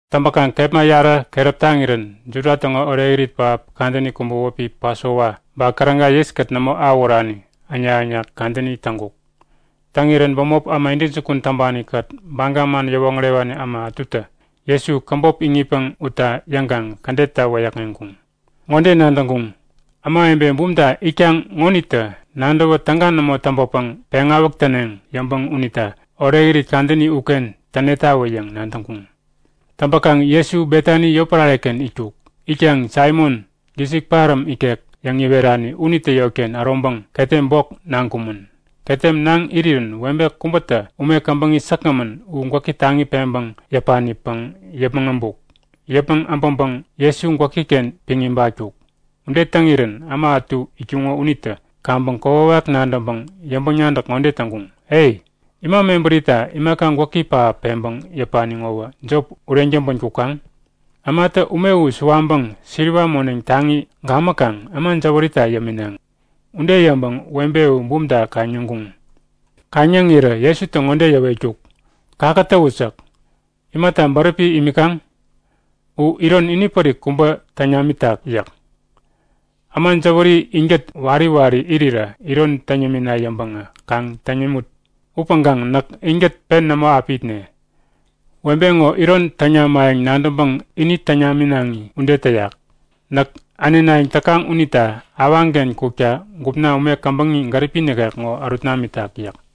Täŋpäkaŋ kepma yarä keräp taŋirän Juda täŋo orekirit pähap kadäni kubä wäpi Pasova ba Käräga yiskät nämo awähurani äŋnak-äŋnak kadäni täŋkuk. Täŋirän bämop äma intäjukun täŋpani-kät Baga man yäwoŋärewani äma ätutä Jesu käbop iŋitpäŋ utna yäŋkaŋ kädetta wäyäkŋeŋkuŋ. Ŋode nadäŋkuŋ; Ämawebe bumta itkaŋ ŋonitä nadäwä täga nämo täŋpäpäŋ peŋawäk täneŋ yäŋpäŋ unita orekirit kadäni uken tänetawä yäŋ nadäŋkuŋ. Täŋpäkaŋ Jesu Betani yotpärare-ken itkuk. Itkaŋ Saimon, gisik paräm ikek yäŋ iwerani unitä yotken äroŋpäŋ ketem bok naŋkumän. Ketem naŋ irirän webe kubätä ume käbäŋi säkgämän u gwäki taŋi peŋpäŋ yäpanipäŋ yäpmäŋ äbuk. Yäpmäŋ äbäŋpäŋ Jesu gwäki-ken piŋ ibatkuk. Ude täŋirän äma ätu itkuŋo unitä kaŋpäŋ kokwawak nadäŋpäŋ yäŋpäŋ-nadäk ŋode täŋkuŋ; E! Ima mebärita imaka gwäki pähap peŋpäŋ yäpani ŋowä jop ureŋ täŋpän kukaŋ? Ämatä ume u suwaŋpäŋ siliwa moneŋ taŋi gamäkaŋ äma jäwärita yäminaŋi. Ude yäŋpäŋ webe u bumta kaŋ-yäŋkuŋ. Kaŋ-yäŋ irirä Jesutä ŋode yäwetkuk; Kakätäwut! yäk. Imata bäräpi imikaŋ? U iron inipärik kubä täŋ namitak yäk. Äma jäwäri inkät wari wari irirä iron täŋ yämina yäŋpäŋä kaŋ täŋ yämut! Upäŋkaŋ näk inkät pen nämo api itne. Webe ŋo iron täŋ namayäŋ nadäŋpäŋ ini täŋ naminaŋi ude täyak. Näk änenayäŋ täkaŋ unita awaŋken kukta gupna ume käbäŋi gäripi nikek ŋo ärut namitak yäk.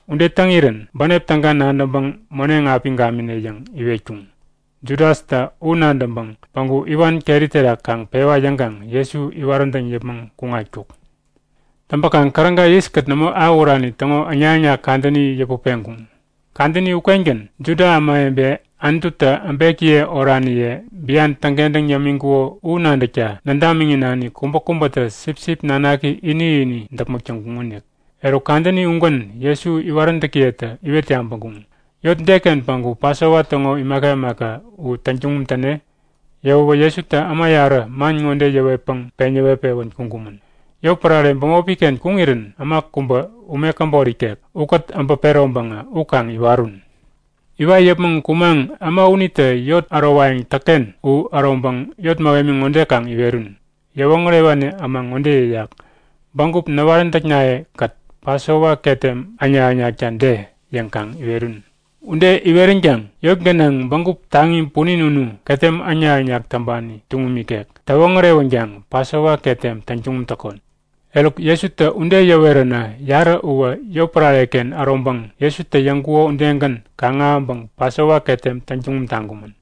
Ude täŋirän bänep täga nadäŋpäŋ moneŋ api gamine yäŋ iwetkuŋ. Judastä u nadäŋpäŋ päŋku iwan keri terak kaŋ pewa yäŋkaŋ Jesu iwaräntäŋ yäpmäŋ kuŋatkuk. Täŋpäkaŋ käräga yiskät nämo awähurani täŋo äŋnak-äŋnak kadäni yäput peŋkuŋ. Kadäni ukengän Juda ämawebe Anututä äbekiye oraniye bian täŋkentäŋ yämiŋkuko u nadäkta nädamiŋi-nani kubäkubätä sipsip nanaki ini-ini däpmäk täŋkuŋonik. Eruk kadäni ugän Jesu iwaräntäkiyetä iwet yabäŋkuŋ; Yot deken päŋku Pasova täŋo imaka imaka u täŋtuŋum täne? Yäwäwä Jesutä äma yarä man ŋode yäwetpäŋ peŋ yäwet-pewän kuŋkumän; Yotpärare bämopi-ken kuŋirän äma kubä ume käbot ikek ukät äbä peroŋpäŋä u kaŋ iwarun! Iwat yäpmäŋ kumaŋ äma unitä yot ärowayäŋ täkken u äroŋpäŋ yot mähemi ŋode kaŋ iwerun; Yäwoŋärewani äma ŋode yäyak; Bägup näwaräntäknaye-kät Pasova ketem äŋnak-äŋnakta de? yäŋkaŋ iwerun. Ude iweränkaŋ yot gänaŋ bägup taŋi punin unu ketem äŋnak-äŋnak täŋpani tuŋum ikek täwoŋärewänkaŋ Pasova ketem täŋtuŋum täkon. Eruk Jesutä ude yäweränä yarä uwä yotpärare-ken äroŋpäŋ Jesutä yäŋkuko udegän kaŋ-ahäŋpäŋ Pasova ketem täŋtuŋum taŋkumän.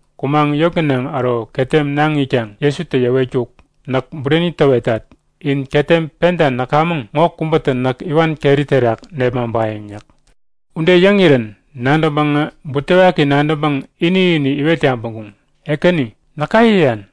Kumaŋ yot gänaŋ äro ketem naŋ itkaŋ Jesutä yäwetkuk; Näk bureni täwetat. In ketem penta näkamäŋ ŋo kubätä näk iwan keri terak nepmaŋpayäŋ yäk. Ude yäŋirän nadäŋpäŋä butewaki nadäŋpäŋ ini-ini iwet yabäŋkuŋ; Ekäni, näka yäyan?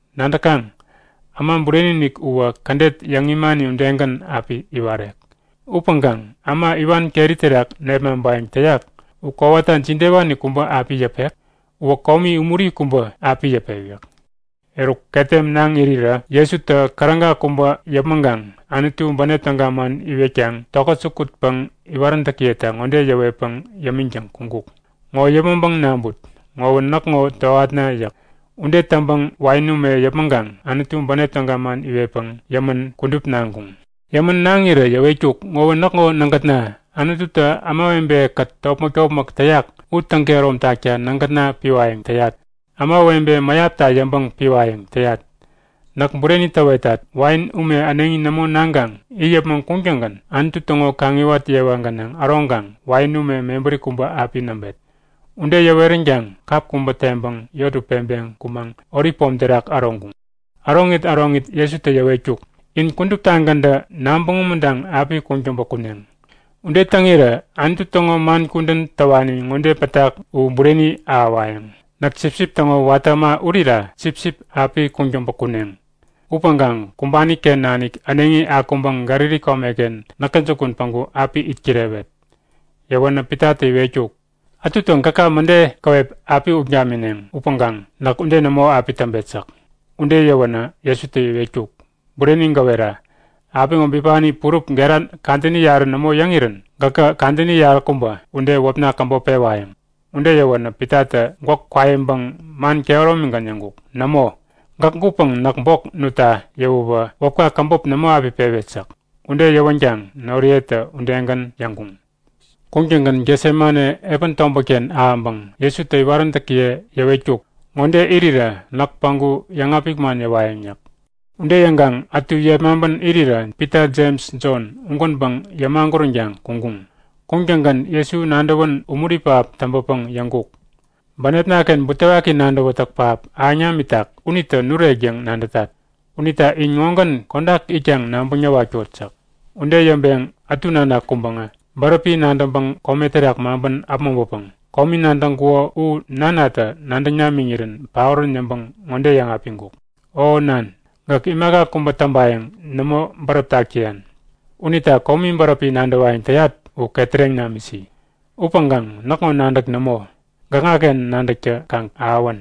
Nadäkaŋ? Äma Bureni-inik uwä kädet yäŋ imani udegän api iwarek. Upäŋkaŋ äma iwan keri terak nepmaŋpayäŋ täyak u kowata jidewani kubä api yäpek? Uwä komi umuri kubä api yäpek yäk. Eruk ketem naŋ irirä Jesutä käräga kubä yäpmäŋkaŋ Anutu bänep täga man iwetkaŋ tokät jukutpäŋ iwaräntäkiyeta ŋode yäwetpäŋ yämiŋtäŋ kuŋkuk; Ŋo yäpmäŋpäŋ naŋput. Ŋowä näkŋo tohatna yäk. Ude yäŋpäŋ wain ume yäpmäŋkaŋ Anutu bänep täga man iwetpäŋ yämän kudup naŋkuŋ. Yämän naŋirä yäwetkuk; Ŋowä näkŋo nägätna. Anututä ämawebe-kät topmäk-topmäk täyak u täŋkehärom takta nägätna piwayäŋ täyat. Ämawebe mäyapta yäŋpäŋ piwayäŋ täyat. Näk bureni täwetat. Wain ume äneŋi nämo naŋkaŋ it yäpmäŋ kuŋtäŋgän Anutu täŋo kaŋiwat yewa gänaŋ äroŋkaŋ wain ume mebäri kubä api näŋpet. Ude yäweränkaŋ kap kubä teŋpäŋ yot u peŋpeŋ kumaŋ Olip Pom terak äroŋkuŋ. Äroŋit äroŋit Jesutä yäwetkuk; In kuduptagäntä nabäŋ umuntaŋ api kuŋtäŋpä kuneŋ. Ude täŋirä Anutu täŋo man kudän täwani ŋode pätak u bureni ahäwayäŋ; Näk sipsip täŋo watä äma urira sipsip api kuŋtäŋpä kuneŋ. Upäŋkaŋ kumbani-ken nanik äneŋi akuŋpäŋ Galili komeken näkä jukun päŋku api itkirewet. Yäwänä Pitatä iwetkuk; Ätutä gäka mäde käwep api ut gamineŋ upäŋkaŋ näk ude nämo api täŋpet yäk. Ude yäwänä Jesutä iwetkuk; Bureni gäwera; Apiŋo bipani purup gera kadäni yarä nämo yäŋirän gäkä kadäni yaräkubä ude wäpna käbop pewayäŋ. Ude yäwänä Pitatä gwäk kwaiŋpäŋ man kehäromigän yäŋkuk; Nämo! Gäk gutpäŋ näk bok nutta yäwäwä wäpka käbop nämo api pewet yäk. Ude yäwänkaŋ noriyetä udegän yäŋkuŋ. Kuŋtäŋgän Getsemane epän tobätken ahäŋpäŋ Jesutä iwaräntäkiye yäwetkuk; Ŋode irirä näk päŋku yäŋapik man yäwayäŋ yäk. Ude yäŋkaŋ ätu yepmaŋpän irirä Pita Jems Jon ugänpäŋ yämaguränkaŋ kuŋkuŋ. Kuŋtäŋgän Jesu nadäwän umuri pähap täŋpäpäŋ yäŋkuk; Bänepna-ken butewaki nadäwätäk pähap ahäŋ namitak unitä nurek yäŋ nadätat. Unita in ŋogän kodak itkaŋ nabäŋ näwatkot yäk. Ude yäŋpeŋ ätu nanak kuŋpäŋä bäräpi nadäŋpäŋ kome terak maŋpän äpmoŋpäpäŋ komi nadäŋkuko u nanatä nadäŋ namiŋirän paorän yäŋpäŋ ŋode yäŋapiŋkuk; O nan, gäk imaka kubä täŋpayäŋ nämo bäräp tak täyan. Unita komi bäräpi nadäwayäŋ täyat u ketäreŋ namisi. Upäŋkaŋ näkŋo nadäk nämo, gäkŋaken nadäktä kaŋ ahäwän.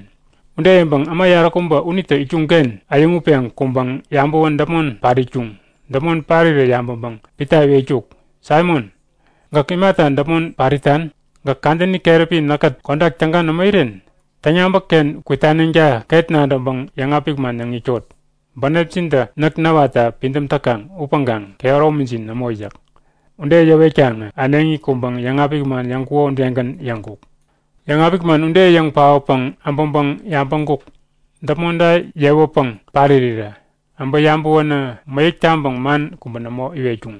Ude yäŋpäŋ äma yaräkubä unitä itkuŋ-ken äyäŋutpeŋ kuŋpäŋ yabäwän däpmon pat itkuŋ. Däpmon parirä yabäŋpäŋ Pita iwetkuk; Saimon! Gäk imata däpmon pat itan? Gäk kadäni keräpi näkkät kodak täga nämo iren? Täŋyabäk-ken kwitaneŋta ket nadäŋpäŋ yäŋapik man yäŋ itkot. Bänepjintä näk näwatta pidäm täkaŋ upäŋkaŋ kehäromijin nämo yäk. Ude yäwetkaŋä äneŋi kuŋpäŋ yäŋapik man yäŋkuko udegän yäŋkuk. Yäŋapik man ude yäŋ paotpäŋ äbäŋpäŋ yabäŋkuk; Däpmonta yewäpäŋ pat irirä. Abä yabäwänä mäyäk taŋpäŋ man kubä nämo iwetkuŋ.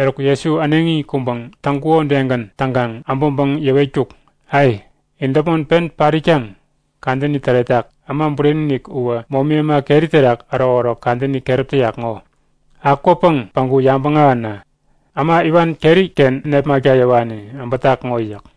Eruk Jesu äneŋi kuŋpäŋ täŋkuko udegän täŋkaŋ äbäŋpäŋ yäwetkuk; Ai! In däpmon pen pat itkaŋ? Kadäni täretak! Äma Bureni-inik uwä momi äma keri terak ärokärok kadäni keräp täyak ŋo. Akwäpäŋ päŋku yabäŋ ahäna! Äma iwan keri-ken nepmakta yäwani äbätak ŋo yäk.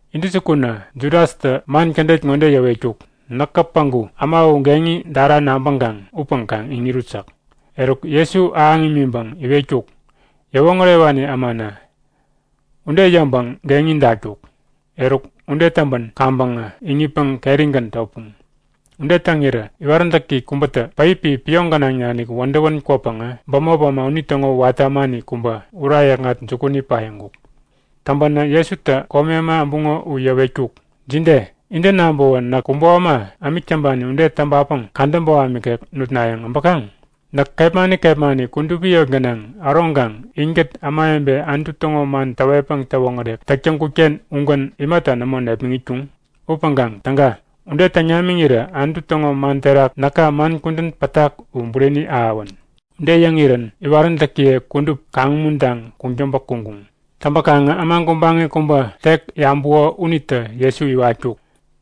Intäjukunä Judastä man kädet ŋode yäwetkuk; Näkä päŋku äma u geŋi dara nabäŋkaŋ upäŋ kaŋ iŋirut yäk. Eruk Jesu ahäŋ imiŋpäŋ iwetkuk; Yäwoŋärewani ämana! Ude yäŋpäŋ geŋi datkuk. Eruk, ude täŋpän kaŋpäŋä iŋitpäŋ kerigän topuŋ. Ude täŋirä iwaräntäki kubätä päipi pioŋ gänaŋ nanik wädäwän kwäpäŋä bämop äma unitäŋo watä ämani kubä ura yäkŋat jukuni paiŋkuk. Täŋpänä Jesutä komi äma äbuŋo u yäwetkuk; Jide? Intä nabäwä näk kubo äma ämik täŋpani ude täŋpapäŋ kadä boham ikek nutnayäŋ äbäkaŋ? Näk kepmani kepmani kudupi yot gänaŋ äroŋkaŋ inkät ämawebe Anutu täŋo man täwetpäŋ täwoŋärek täk täŋkut-ken ugän imata nämo nepmäŋitkuŋ? Upäŋkaŋ täga! Ude täŋ namiŋirä Anutu täŋo man terak näka man kudän pätak u bureni ahäwän. Ude yäŋirän iwaräntäkiye kudup kaŋ-umuntaŋ kuŋtäŋpä kuŋkuŋ. Täŋpäkaŋä äma gubaŋi kubä tek yabuko unitä Jesu iwatkuk.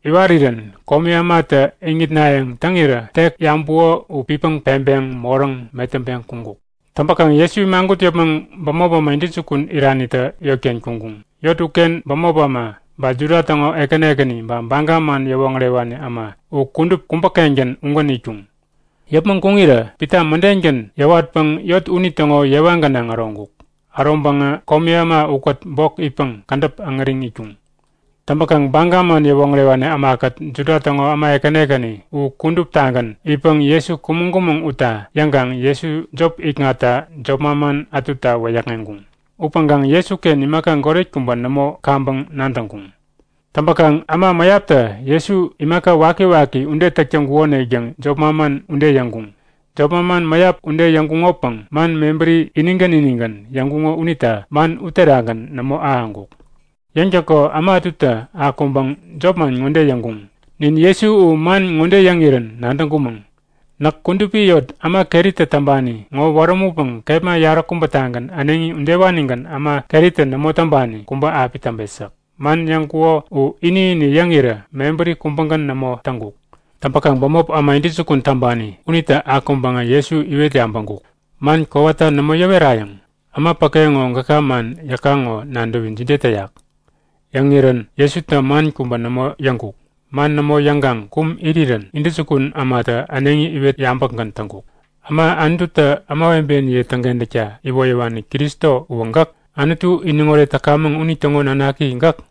Iwarirän komi ämatä iŋitnayäŋ täŋirä tek yabuko u pitpäŋ peŋpeŋ moräŋ metäŋpeŋ kuŋkuk. Täŋpäkaŋ Jesu imagut yäpmäŋ bämop äma intäjukun iranitä yotken kuŋkuŋ. Yot uken bämop äma, ba Juda täŋo ekäni ekäni ba Baga man yäwoŋärewani äma u kudup kubä-kengän ugän itkuŋ. Yäpmäŋ kuŋirä Pita mädengän yäwatpäŋ yot unitäŋo yewa gänaŋ äroŋkuk. Äroŋpäŋä komi äma ukät bok itpäŋ kädäp äŋäriŋ itkuŋ. Täŋpäkaŋ Baga man yäwoŋärewani ämakät Juda täŋo äma ekäni ekäni u kuduptagän itpäŋ Jesu kumäŋ-kumäŋ utna yäŋkaŋ Jesu jop ikŋatta jop manman ätuta wäyäkŋeŋkuŋ. Upäŋkaŋ Jesuken imaka goret kubä nämo kaŋpäŋ nadäŋkuŋ. Täŋpäkaŋ äma mäyaptä Jesu imaka wakiwaki ude täk täŋkukonik yäŋ jop manman ude yäŋkuŋ. Jop manman mäyap ude yäŋkuŋopäŋ man mebäri inigän inigän yäŋkuŋo unita man uterakgän nämo ahäŋkuk. Yäŋtäko äma ätutä akuŋpäŋ jopman ŋode yäŋkuŋ; Nin Jesu u man ŋode yäŋirän nadäŋkumäŋ; Näk kudupi yot äma keritä täŋpani ŋo wärämutpäŋ kepma yaräkubätagän äneŋi udewanigän äma keritä nämo täŋpani kubä api täŋpet yäk. Man yäŋkuŋo u ini-ini yäŋirä mebäri kubägän nämo täŋkuk. Täŋpäkaŋ bämop äma intäjukun täŋpani unitä akuŋpäŋä Jesu iwet yabäŋkuk; Man kowata nämo yäwerayäŋ? Äma päke ŋo gäka man yäkaŋ ŋo nadäwi jide täyak? Yäŋirän Jesutä man kubä nämo yäŋkuk. Man nämo yäŋkaŋ kum irirän intäjukun ämatä äneŋi iwet yabäkgän täŋkuk; Äma Anututä ämawebeniye täŋkentäkta iwoyäwani Kristo uwä gäk? Anutu iniŋoret täkamäŋ unitäŋo nanaki gäk?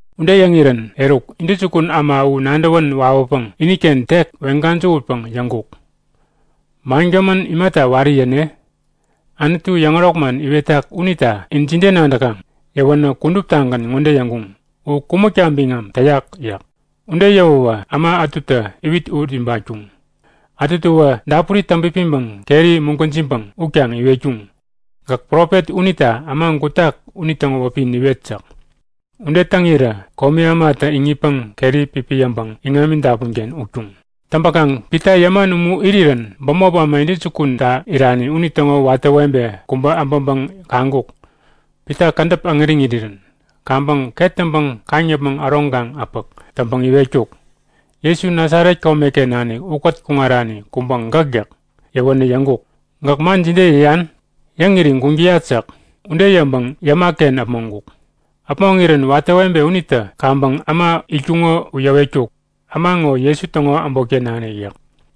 Ude yäŋirän eruk, intäjukun äma u nadäwän wawäpäŋ iniken tek weŋ-gäjähutpäŋ yäŋkuk; Mangämän imata wari yäne? Anutu yäŋärok man iwetak unita in jide nadäkaŋ? Yäwänä kuduptagän ŋode yäŋkuŋ; U kumäkta biŋam täyak yäk. Ude yäwäwä äma ätutä iwit ut ibatkuŋ, ätutäwä dapuri täŋpipiŋpäŋ keri mugwäjiŋpäŋ utkaŋ iwetkuŋ; Gäk profet unita äma gutak unitäŋo wäpi niwet! yäk. Ude täŋirä komi ämatä iŋitpäŋ keri pipiyäŋpäŋ iŋami dapun-ken utkuŋ. Täŋpäkaŋ Pita yäman umu irirän bämop äma intäjukunta irani unitäŋo watä webe kubä äbäŋpäŋ kaŋkuk; Pita kädäp äŋäriŋ irirän. Kaŋpäŋ ket täŋpäŋ kaŋ-yäpmäŋ äroŋkaŋ-äpäk täŋpäŋ iwetkuk; Jesu Nasaret komeken nanik ukät kuŋarani kubä gäk yäk. Yäwänä yäŋkuk; Gäk man jide yäyan? Yäŋiri guŋ täyat yäk. Ude yäŋpäŋ yäma-ken äpmoŋkuk. Äpmoŋirän watä webe unitä kaŋpäŋ äma itkuŋo u yäwetkuk; Äma ŋo Jesu täŋo äbotken nanik yäk.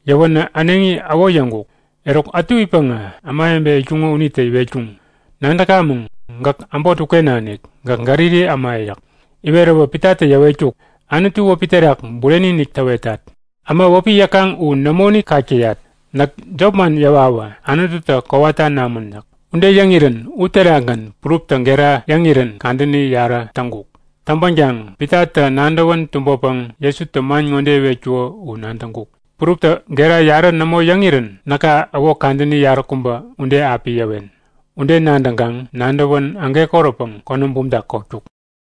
Yäwänä äneŋi äwo yäŋkuk. Eruk ätu itpäŋä ämawebe itkuŋo unitä iwetkuŋ; Nadäkamäŋ! Gäk äbot uken nanik. Gäk Galili äma! yäk. Iweräwä Pitatä yäwetkuk; Anutu wäpi terak bureni-inik täwetat! Äma wäpi yäkaŋ u nämoinik kak täyat! Näk jopman yäwawä Anututä kowata namän yäk. Ude yäŋirän uterakgän puruptä gera yäŋirän kadäni yarä täŋkuk. Täŋpänkaŋ Pitatä nadäwän tumbäpäŋ Jesutä man ŋode iwetkuko u nadäŋkuk; Puruptä gera yarä nämo yäŋirän näka äwo kadäni yaräkubä ude api yäwen. Ude nadäŋkaŋ nadäwän ägekoräpäŋ konäm bumta kotkuk.